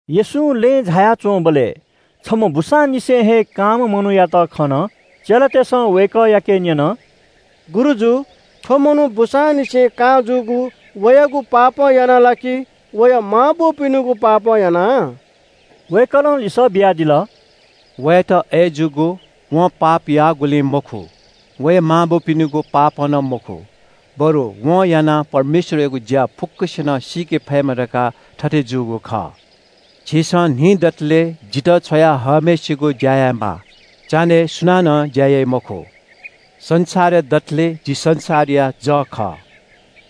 येशूं लँय् झाया च्‍वंबलय् छम्‍ह बूसांनिसें हे कांम्‍ह मनूयात खन। चेलातय्‌सं वय्‌कःयाके न्‍यन – “गुरुजु, थ्‍व मनू बूसांनिसें कां जूगु वयागु पापं यानाः ला कि वया मांबौपिनिगु पापं यानाः?” वय्‌कलं लिसः बियादिल – “वयात अय् जूगु वं पाप याःगुलिं मखु, वया मांबौपिनिगु पापं नं मखु, बरु व मनुखं यानाः परमेश्‍वरयागु ज्‍या फुक्‍कसिनं सीके फयेमा धकाः थथे जूगु खः। झीसं न्‍हि दतले जितः छ्वया हःम्‍हय्‌सिगु ज्‍या यायेमाः, चान्‍हय् सुनानं ज्‍या याइ मखु। संसारय् दतले जि संसारया जः खः।”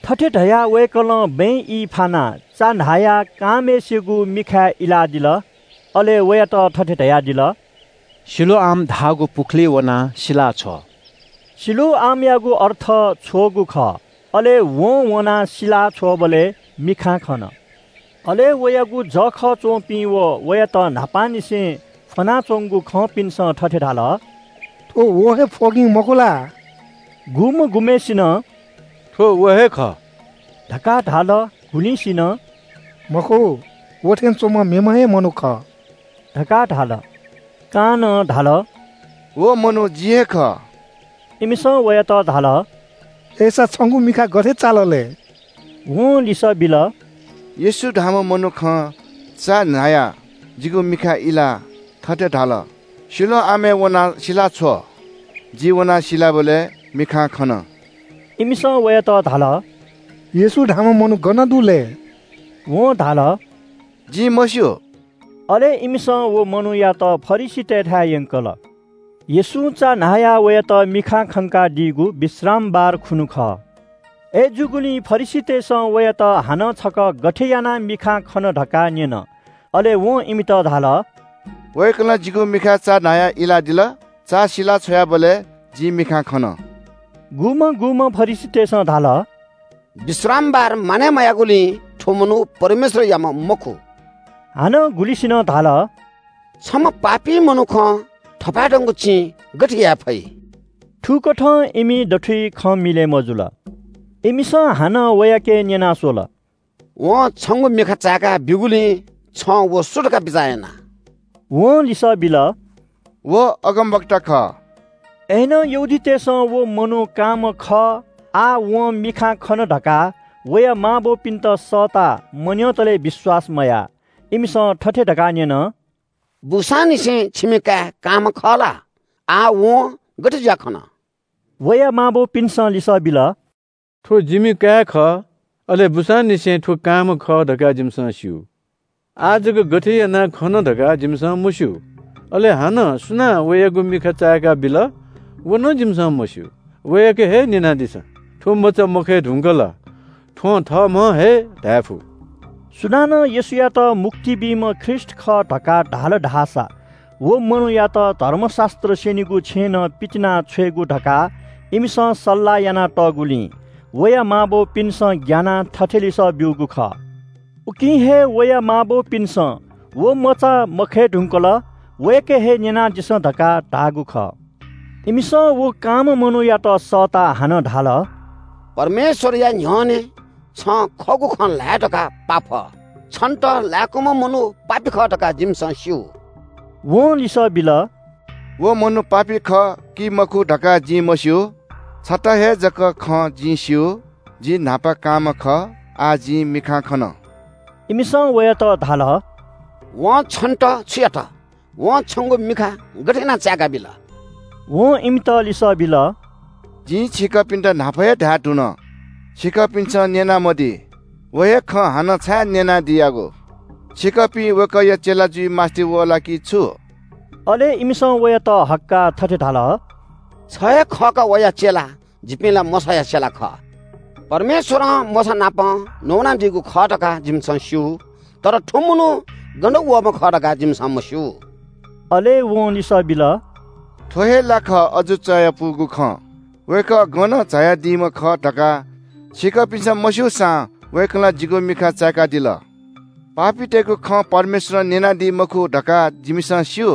थथे धयाः वय्‌कलं बँय् ई फानाः चा न्‍हायाः कांम्‍हय्‌सिगु मिखाय् इलादिल। अले वयात थथे धयादिल – “सिलोआम धाःगु पुखुलिइ वनाः सिलाछ्व।” सिलोआमयागु अर्थ “छ्वःगु” खः। अले वं वनाः सिला छ्वःबलय् मिखां खन। अले वयागु जःखः च्‍वंपिं व वयात न्‍हापांनिसें फ्‍वनाच्‍वंगु खंपिन्‍सं थथे धाल – “थ्‍व व हे फ्‍वगिं, मखु ला?” गुम्‍ह गुम्‍हय्‌सिनं “थ्‍व व हे खः” धकाः धाल, गुलिंसिनं “मखु, व थें च्‍वंम्‍ह मेम्‍ह हे मनू खः” धकाः धाल। कांनं धाल – “व मनू जि हे खः।” इमिसं वयात धाल – “अय्‌सा छंगु मिखा गथे चाल लय्?” वं लिसः बिल – “येशू धाःम्‍ह मनुखं चा न्‍हायाः जिगु मिखाय् इलाः थथे धाल – ‘सिलोआमय् वनाः सिलाछ्व।’ जि वनाः सिलाबलय् मिखां खन।” इमिसं वयात धाल – “येशू धाःम्‍ह मनू गन दु लय्?” वं धाल – “जिं मस्‍यू।” अले इमिसं व मनूयात फरिसीतय्‌थाय् यंकल। येशूं चा न्‍हायाः वयात मिखां खंकादीगु विश्रामबार खुन्‍हु खः। अय्‌जूगुलिं फरिसीतय्‌सं वयात हानं छकः गथे यानाः मिखां खन धकाः न्‍यन। अले वं इमित धाल – “वय्‌कलं जिगु मिखाय् चा न्‍हायाः इलादिल। चा सिला छ्वयाबलय् जिं मिखां खन।” गुम्‍हं गुम्‍हं फरिसीतय्‌सं धाल – “विश्रामबार मानय् मयाःगुलिं थ्‍व मनू परमेश्‍वरयाम्‍ह मखु।” हानं गुलिंसिनं धाल – “छम्‍ह पापी मनुखं थपाय्‌धंगु चिं गथे याये फइ?” थुकथं इमि दथुइ खँ मिलय् मजुल। इमिसं हानं वयाके न्‍यना स्‍वल – “वं छंगु मिखा चाय्‌का ब्‍यूगुलिं छं व सु धकाः बिचाः याना?” वं लिसः बिल – “व अगमवक्ता खः।” अय्‌नं यहूदीतय्‌सं व मनू कांम्‍ह खः, आः वं मिखां खन धकाः वया मांबौपिन्‍त सःताः मन्‍यंतले विश्‍वास मयाः। इमिसं थथे धकाः न्‍यन – “बूसांनिसें छिमि काय् कांम्‍ह खः ला? आः वं गथे जुयाः खन?” वया मांबौपिन्‍सं लिसः बिल – “थ्‍व जिमि काय् खः, अले बूसांनिसें थ्‍व कांम्‍ह खः धकाः जिमिसं स्‍यू। आः जक गथे यानाः खन धकाः जिमिसं मस्‍यू। अले हानं सुनां वयागु मिखा चाय्‌काबिल व नं जिमिसं मस्‍यू। वयाके हे न्‍यनादिसँ। थ्‍व मचा मखय् धुंकल थ्‍वं थःम्‍हं हे धायेफु।” सुनानं येशूयात मुक्ति बीम्‍ह ख्रीष्‍ट खः धकाः धाल धाःसा व मनूयात धर्मशास्‍त्र स्‍यनीगु छेँनं पितिनाछ्वयेगु धकाः इमिसं सल्‍लाह यानातःगुलिं वया मांबौपिन्‍सं ग्‍यानाः थथे लिसः ब्‍यूगु खः। उकिं हे वया मांबौपिन्‍सं “व मचा मखय् धुंकल, वयाके हे न्‍यनादिसँ” धकाः धाःगु खः। इमिसं व कांम्‍ह मनूयात सःताः हानं धाल – “परमेश्‍वरया न्‍ह्यःने छं खःगु खँ ल्‍हाय् धकाः पाफ। छन्‍त लय्‌कूम्‍ह मनू पापी खः धकाः जिमिसं स्‍यू।” वं लिसः बिल – “व मनू पापी खः कि मखु धकाः जिं मस्‍यू। छता हे जक खँ जिं स्‍यू, जि न्‍हापा कांम्‍ह खः, आः जिं मिखां खन।” इमिसं वयात धाल – “वं छन्‍त छु यात? वं छंगु मिखा गथे यानाः चाय्‌काबिल?” वं इमित लिसः बिल – “जिं छिकपिन्‍त न्‍हापा हे धायेधुन, छिकपिन्‍सं न्‍यनामदी। व हे खँ हानं छाय् न्‍यनादियागु? छिकपिं वय्‌कःया चेला जुइ मास्‍ति वः ला कि छु?” अले इमिसं वयात हक्‍काः थथे धाल – “छ हे खः का वया चेला। जिपिं ला मोशाया चेला खः। परमेश्‍वरं मोशानापं नवानादीगु खः धकाः जिमिसं स्‍यू। तर थ्‍व मनू गनं वःम्‍ह खः धकाः जिमिसं मस्‍यू।” अले वं लिसः बिल – “थ्‍व हे ला खः, अजू चायापुगु खँ। वय्‌कः गनं झायादीम्‍ह खः धकाः छिकपिन्‍सं मस्‍यूसां वय्‌कलं जिगु मिखा चाय्‌कादिल। पापीतय्‌गु खँ परमेश्‍वरं न्‍यनादी मखु धकाः जिमिसं स्‍यू।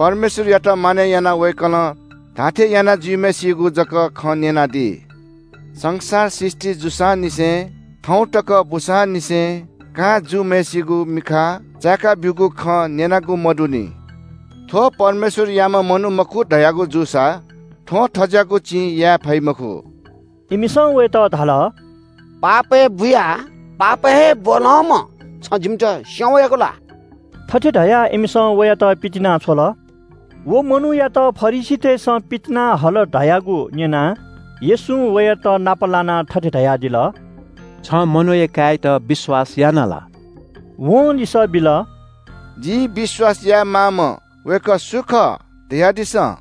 परमेश्‍वरया भय काइम्‍ह व वय्‌कलं धाःथें याना जुइम्‍हय्‌सिगु जक खँ न्‍यनादी। संसार सृष्‍टि जूसांनिसें थौं तक बूसांनिसें कां जूम्‍हय्‌सिगु मिखा चाय्‌का ब्‍यूगु खँ न्‍यनागु मदुनि। थ्‍व परमेश्‍वरयाम्‍ह मनू मखु धयागु जूसा थ्‍वं थज्‍याःगु चिं याये फइ मखु।” इमिसं वयात धाल – “पापय् बुयाः पापय् हे ब्‍वलंम्‍ह छं जिमित स्‍यं वयागु ला?” थथे धयाः इमिसं वयात पितिनाछ्वल। व मनूयात फरिसीतय्‌सं पितिना हल धयागु न्‍यनाः येशूं वयात नाप लानाः थथे धयादिल – “छं मनूया काय्‌यात विश्‍वास यानादिया ला?” वं लिसः बिल – “जिं विश्‍वास यायेमाःम्‍ह वय्‌कः सु खः धयादिसँ।”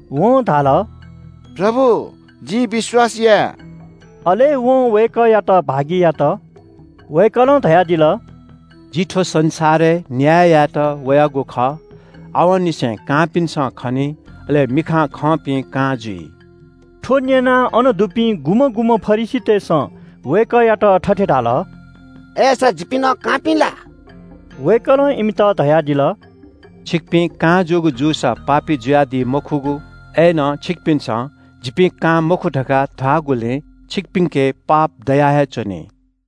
वं धाल – “प्रभु, जिं विश्‍वास याये।” अले वं वय्‌कःयात भागि यात। वय्‌कलं धयादिल – “जि थ्‍व संसारय् न्‍याय यायेत वयागु खः। आवंनिसें कांपिन्‍सं खनी, अले मिखां खंपिं कां जुइ।” थ्‍व न्‍यनाः अन दुपिं गुम्‍हं गुम्‍हं फरिसीतय्‌सं वय्‌कःयात थथे धाल – “अय्‌सा जिपिं नं कांपिं ला?” वय्‌कलं इमित धयादिल – “छिकपिं कां जूगु जूसा पापी जुयादी मखुगु। अय्‌नं छिकपिन्‍सं ‘जिपिं कां मखु’ धकाः धाःगुलिं छिकपिन्‍के पाप दया हे च्‍वनी।”